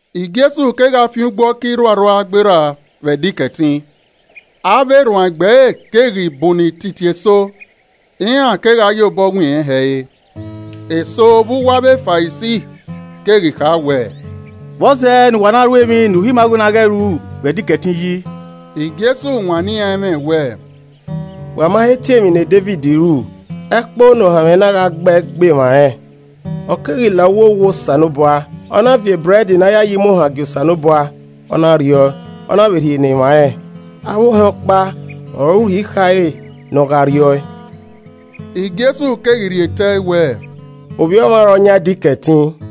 Jesu kegha fian ugbo ọka irhuarhua gberra vbe Ẹdẹ Ikẹtin. Avbe erhuanegbe ẹre keghi bunnọ ititi eso, iran kegha ye obọ wiẹn rẹn hẹ re. Eso vbe uwu avbe Farisi keghi kha wẹẹ, “Vbọzẹ ne uwa na ru emwi ne uhi ima wẹ ne a ghẹ ru vbe Ẹdẹ Ikẹtin yi?” Jesu wanniẹn iran ẹmwẹ wẹẹ, “Wa ma he tie emwi ne Devid ru ẹkpo ne ohanmwẹ na gha gbe ẹe gbe emwa rẹn? Ọ keghi la uwu owa Osanobua, ọ na viọ ebrẹd ne a ya ye imuohan gie Osanobua, ọ na rriẹ ọe, ọ na vbe rhie ne emwa rẹn, avbe ohẹn ọkpa ọre uhi khare ne ọ gha rrie ọe.” Jesu keghi rhie tẹẹ wẹẹ, “Ovbi Ọmwa ọre ọ yan Ẹdẹ Ikẹtin.”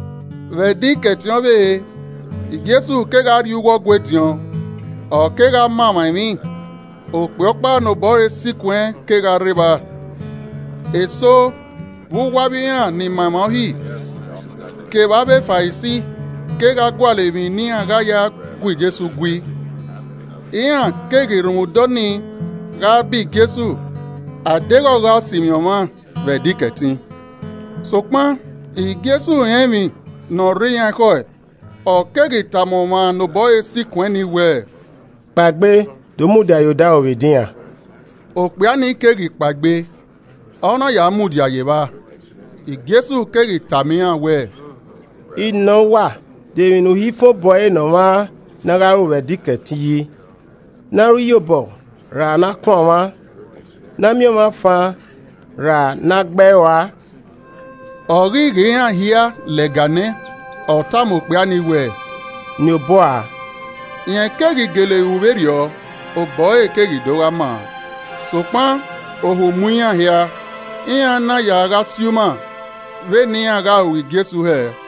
Vbe Ẹdẹ Ikẹtin ọvbehe, Jesu kegha rrie uwu Ọgua ediọn, ọ kegha ma emwa emwi, okpia ọkpa ne obọ ẹre sikuẹn kegha rre evba. Eso vbe uwu avbe iran ni ma emwa Uhi kevbe avbe Farisi kegha gualọ emwi ne iran gha ya gu Jesu gui, iran keghi rhunmwuda ọnii gha ba Jesu a deghẹ ọ gha sinmwi ọmwa vbe Ẹdẹ Ikẹtin. Sokpan Jesu rẹn emwi ne ọ rre iran ekhọe, ọ keghi tama ọmwa ne obọ ẹre sikuẹn ni wẹẹ, “Kpaegbe, do mudia ye odaro vbe edinran.” Okpia ni keghi kpaegbe, ọ na ya mudia ye evba. Jesu keghi tama iran wẹẹ, “I nọ uwa: De emwi ne uhi fan obọ ẹre ne ọmwa ne a gha ru vbe Ẹdẹ Ikẹtin yi, ne a ru iyọbọ ra ne a kuan ọmwa? Ne a miẹn ọmwa fan ra ne a gbe ẹe rua?” Ọ ghi ghe iran hia lẹga nẹ, ọ tama okpia ni wẹẹ, “Niẹn obọ ua,” Rẹn keghi gele ru vberriọ, obọ ẹre keghi do gha maa. Sokpan ohu mu iran hia, iran na ya gha si uma vbene iran gha ru Jesu hẹ.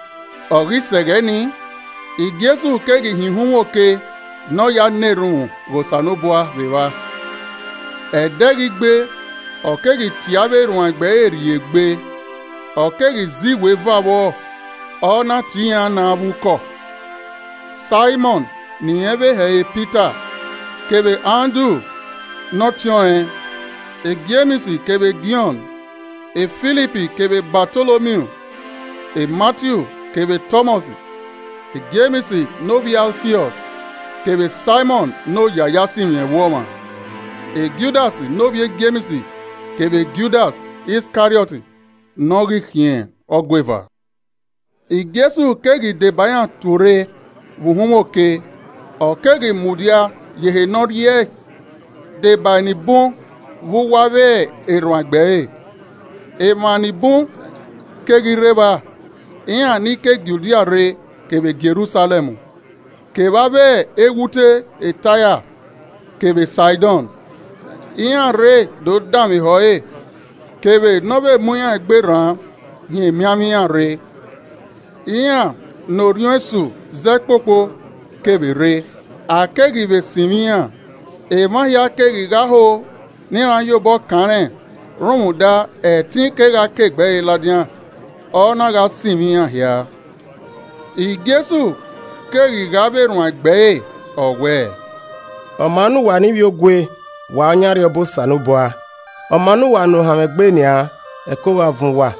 Ọ ghi sẹ ẹghẹ ni, Jesu keghi hin uhunmwu oke ne ọ ya na erhunmwu ghe Osanobua vbe evba. Ẹdẹ ghi gbe, ọ keghi tie avbe erhuanegbe ẹre rrie egbe, ọ keghi zẹ iweva vbọ, ọ na tie iran na avbe ukọ. Saimọn (ne irẹn vbe he ẹre Pita) kevbe Andru ne ọtiọnrẹn, Jems kevbe Jọn, Filip kevbe Batolomiu, Matiu kevbe Tọmọs, Jems, ne ovbi e Alfiọs kevbe Saimọn (ne oya-a-ya-sinmwi-ẹvbo-ọmwa.) Judas ne ovbi e Jems kevbe Judas Iskariọt ne ọ ghi khian ọgueva. Jesu keghi deba iran tuorre vbe uhunmwu oke, ọ keghi mudia ye ehe ne ọ rriẹe deba enibun vbe uwu avbe erhuanegbe ẹre. Emwa ni bun keghi rre evba, iran ni ke Judia rre kevbe Jerusalẹm, kevbe avbe eghute Taia kevbe Saidọn. Iran rre do danmwehọ ẹre kevbe ne ọ vbe mu iran egbe rran hin emianmwẹ iran rre, iran ne orhiọn esu zẹ kpokpo kevbe rre, a keghi vbe sinmwi iran. Emwa hia keghi gha ho ne iran ye obọ kan rẹn rhunmwuda ẹtin kegha ke egbe ẹre ladian, ọ na gha sinmwi iran hia. Jesu keghi ghe avbe erhuanegbe ẹre, ọ wẹẹ: “Ọ maa ne uwa ne ivbiogue: Wa ọ yan Arriọba Osanobua. Ọ maa ne uwa ne ohanmwẹ gbe nian: Ẹko gha vuọn uwa.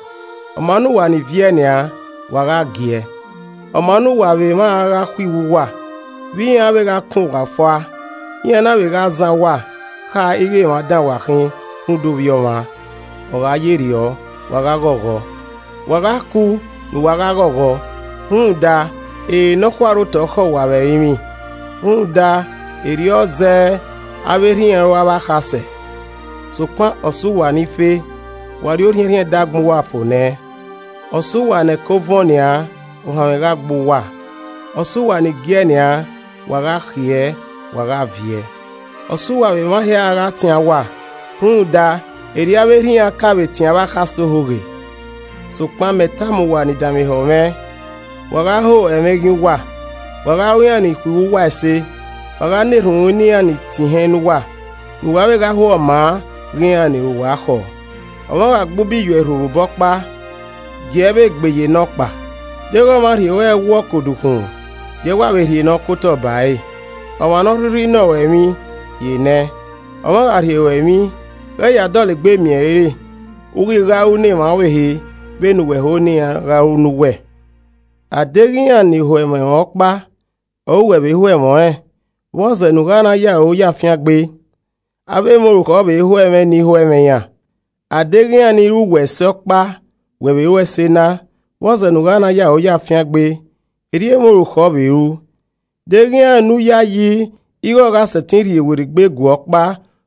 Ọ maa ne uwa ni viẹ nian: wa gha giẹ. “Ọ maa ne uwa vbe emwa a gha khuiwu uwa, vbe iran a vbe kan uwa fua, iran na vbe gha zan uwa kha ighẹ emwa dan wa khin rhunmwuda Ovbi Ọmwa. Ọ gha ye rriọ, wa gha ghọghọ, wa gha kuu ne uwa gha ghọghọ, rhunmwuda, ere nọkhua rre otọ khẹ uwa vbe ẹrinmwi rhunmwuda erriọ zẹẹ avbe erha iran ru avbe akhasẹ. “Sokpan ọ sẹ uwa ni fe; wa rri orhiẹnrhiẹn ẹdẹ agbọn uwa fo nẹ. Ọ sẹ uwa ne ẹko vuọẹn nian: Ohanmwẹ gha gbe uwa ọ sẹ uwa ni giẹ nian: Wa gha khiẹ, wa gha viẹ. “Ọ sẹ uwa vbe emwa hia gha tian uwa, rhunmwuda erriọ avbe erha iran ka vbe tian avbe akhasẹ ohoghe. “Sokpan mẹ tama uwa ni danmwehọ mwẹ, wa gha ho ẹmwẹ eghian uwa, wa gha ru iran ni khuiwu uwa ẹse. Wa gha na erhunmwu ne iran ni tie ihẹn ne uwa, ne uwa vbe gha ho ọ maa ghe iran ni ru uwa khọ. Ọmwa gha gbe ubi ye uẹ irho vbe obọ ọkpa, gie ẹe vbe gbe ye nọkpa. Deghẹ ọmwa rhie ruẹ ẹwu ọ ke odukhunmwu, gie ẹe wa vbe rhie ọ kotọ bare. Ọmwa ne ọ rhirhi nọ ruẹn emwi, rhie nẹ, ọmwa gha rhie ruẹ emwi ghẹ ya dọlegbe miẹn ẹre re. U ghi gha ru ne emwa ọvbehe vbene uwẹ ho ne iran vbe gha ru ne uwẹ. “A deghẹ iran ni ho ẹmwẹ ruẹn ọkpa ọre uwẹ vbe ho ẹmwẹ ọnrẹn, vbọzẹ ne u gha na ye aro ye afiangbe. Avbe emwa orukhọ vbe ho ẹmwẹ ni ho ẹmwẹ iran. A deghẹ iran ni ru uwẹ ẹse ọkpa wẹ vbe ru ẹse na, vbọzẹ ne u gha na ye aro ye afiangbe? Erriọ emwa orukhọ vbe ru! Deghẹ iran ne u yayi ighẹ ọ gha sẹtin rhie werriegbe guẹ ọkpa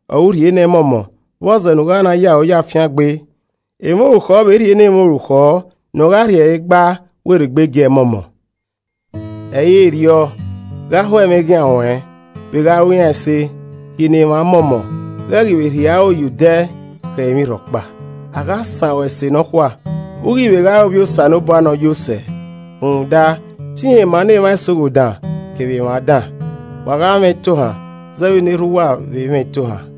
ọre u rhie nẹ mọmọ, vbọzẹ nu u gha na ye aro ye afiangbe. Emwa orukhọ vbe rhie ne emwa orukhọ nọ gha rhie ẹre gba werriegbe gie ẹe mọmọ. Ẹ i re rriọ! Gha ho ẹmwẹ eghian ruẹn, vbe gha ru iran ẹse, rhie ne emwa mọmọ, ghẹ ghi vbe rhie aro ye odẹ khẹ emwi rhọkpa. A gha san ruẹn ẹse nọkhua, u ghi vbe gha re ovbi Osanobua Ne Ọ Yo Sẹ, rhunmwuda te irẹn maa ne emwa ẹse oghodan kevbe emwa dan. Wa gha mwẹ itohan zẹ vbene erha uwa vbe mwẹ itohan.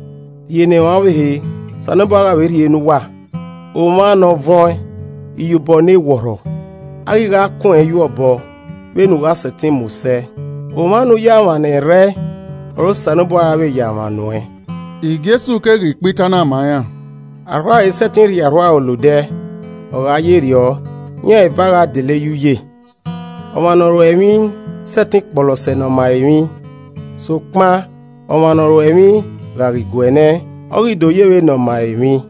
Rhie ne emwa ọvbehe, Osanobua gha vbe rhie ne uwa, omwa ne ọ vuọẹn, iyobọ ne wọrhọ, a ghi gha kun ẹnrẹn yuẹ obọ vbene u gha sẹtin mu sẹ. Omwa ne u ya mwa ne ẹrrẹe ọre Osanobua ra vbe ya mwa nuẹn.” Jesu keghi kpa itan na ma iran, “Arhuaro i sẹtin rhie arhuaro la odẹ, ọ gha ye rriọ, iran eva gha dele ye uye. Ọmwa ne ọ ruẹ emwi i sẹtin kpọlọ sẹ ne ọ ma ẹre emwi, sokpan ọmwa ne ọ ruẹ emwi gha ghi guẹ nẹ, ọ ghi do ye vbe ne ọ ma ẹre emwi.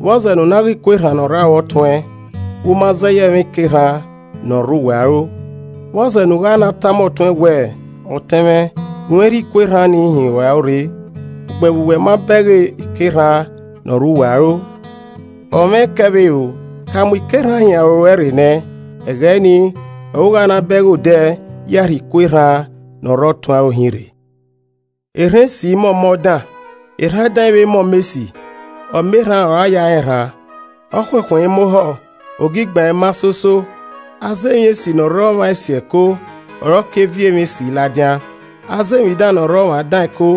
“Vbọzẹ ne u na ghe iku erhan ne ọ rre aro ọtuẹn vbe u ma zẹ ye ẹmwẹ ike erhan ne ọ rre uwẹ aro? Vbọzẹ ne u gha na tama ọtuẹn wẹ, ‘Ọtẹn mwẹ, gunmwẹ rhie iku erhan nii hin ruẹn aro rre,’ ugbẹn vbe uwẹ ma bẹghe ike erhan ne ọ rre uwẹ aro? Ọmwa ẹkẹ vbe ero, ka mu ike erhan hin aro ruẹ rre nẹ, ẹghẹ nii ọre u gha na bẹghe odẹ ya rhie iku erhan ne ọ rre ọtuẹn aro hin rre. “Erhan esi, ẹ mọ ọmọ dan, erhan dan i vbe mọ ọmọ esi. Ọmọ erhan ọre a ya rẹn erhan. Ọkhuẹnkhuẹn i mọ ohọ, ogigban i mọ azara. Aza emwi esi ne Ọ rre ọmwa esi ẹko, ọre ọ ke viọ emwi esi ladian, aza emwi dan ne ọ rre ọmwa dan ẹko,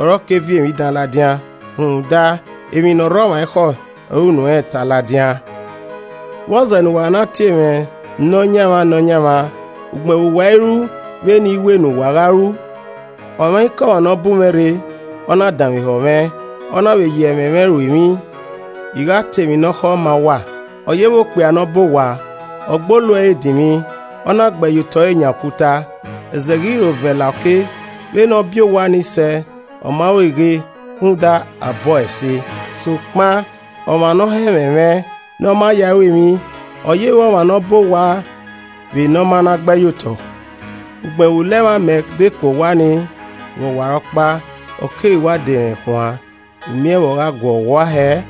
ọre ọ ke viọ emwi dan ladian. Rhunmwuda emwi ne ọ re ọmwa ekhọe ọre unu ẹnrẹn ta ladian. “Vbọzẹ ne uwa na tie mwẹ, ‘Nọyaẹnmwa, Nọyaẹnmwa’ ugbẹn vbe uwa i ru vbene I wẹ ne uwa gha ru? Ọmwaikọmwa ne ọ bu mwẹ rre, ọ na danmwehọ mwẹ, ọ na vbe ye ẹmwẹ mwẹ ru emwi, I gha ta emwi ne ọ khọ ma uwa. Ọ yevbe okpia ne ọ bọ owa, ọ gbe olu ẹre dinmwi, ọ na gbe ẹyotọ ẹre yan okuta. Ẹzẹ keghi ro vẹ la oke, vbene ọ bi owa ni sẹ, ọ ma rueghe rhunmwuda a bọ ẹe ẹse. Sokpan ọmwa ne ọ họn ẹmwẹ mwẹ ne ọ ma ya ẹe ru emwi, ọ ye vbe ọmwa ne ọ bọ owa vbe ne ọ ma na gbe ẹyotọ, ugbẹn vbe ulẹmwẹ amẹ dekun owa ni, vbe ọwarọkpa, ọ keghi wa de rẹnkhẹn uan! U miẹn vbe ọ guọghọ ua hẹẹ!”